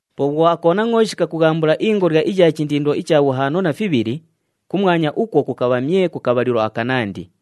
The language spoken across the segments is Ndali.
Po bhwo aKonangʼooshi kakughambula ingolya iya chindindo icha bhuhaano na fibhili, kumwanya ukwo kukabha myee ku kabhalilo akanandi.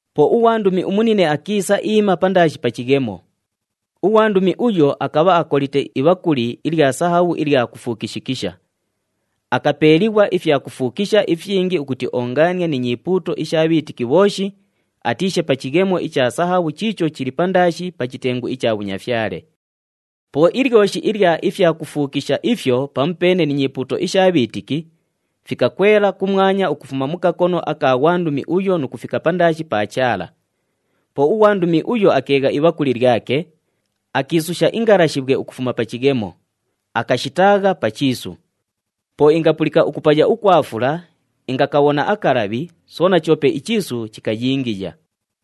Po ughwandumi umunine akiisa iima pandaashi pa chighemo. Ughwandumi uyo akabha akolite ibhakuli ilya sahabhu ilya kufuukishikisha. Akapeeliighwa ifyakufuukisha ifyingi ukuti oongaanie ni nyipuuto isha bhiitiki bhooshi, atiishe pa chighemo icha sahabhu chiicho chili pandaashi pa chitengu icha bhunyafyale. Po ilyoshi ilya ifyakufuukisha ifyo pamupeene ni nyipuuto isha bhiitiki, fikakwela kumwanya ukufuma mu kakono aka ghwandumi uyo nu kufika pandaashi pa Chaala. Po ughwandumi uyo akeegha ibhakuli lyake, akiisusha ingalashibhwe ukufuma pa chighemo, akashitaagha pa chiisu. Po ingapulika ukupaya ukwa fula, ingakabhona akalabhi, soona choope ichiisu chikayingiya.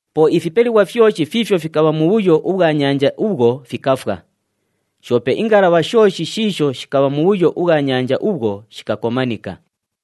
Po ifipelighwa fyoshi fiifyo fikabha mubhuyo ubhwa nyanja ubhwo, fikafwa. Shoope ingalabha shooshi shiisho shikabha mubhuyo ubhwa nyanja ubhwo, shikakomanika.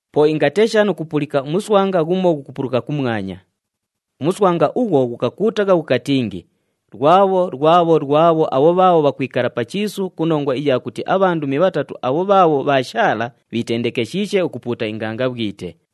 Po ingatesha nu kupulika umuswanga ghumo ghukupuluka kumwanya. Umuswanga ughwo ghukakuutagha ghukatingi, “Lwabho, lwabho, lwabho abho bhaabho bhakwikala pa chiisu ku nongwa iya kuti abhandumi bhatatu abho bhaabho bhaashaala bhiitendekeshiishe ukupuuta ingangabhwite!”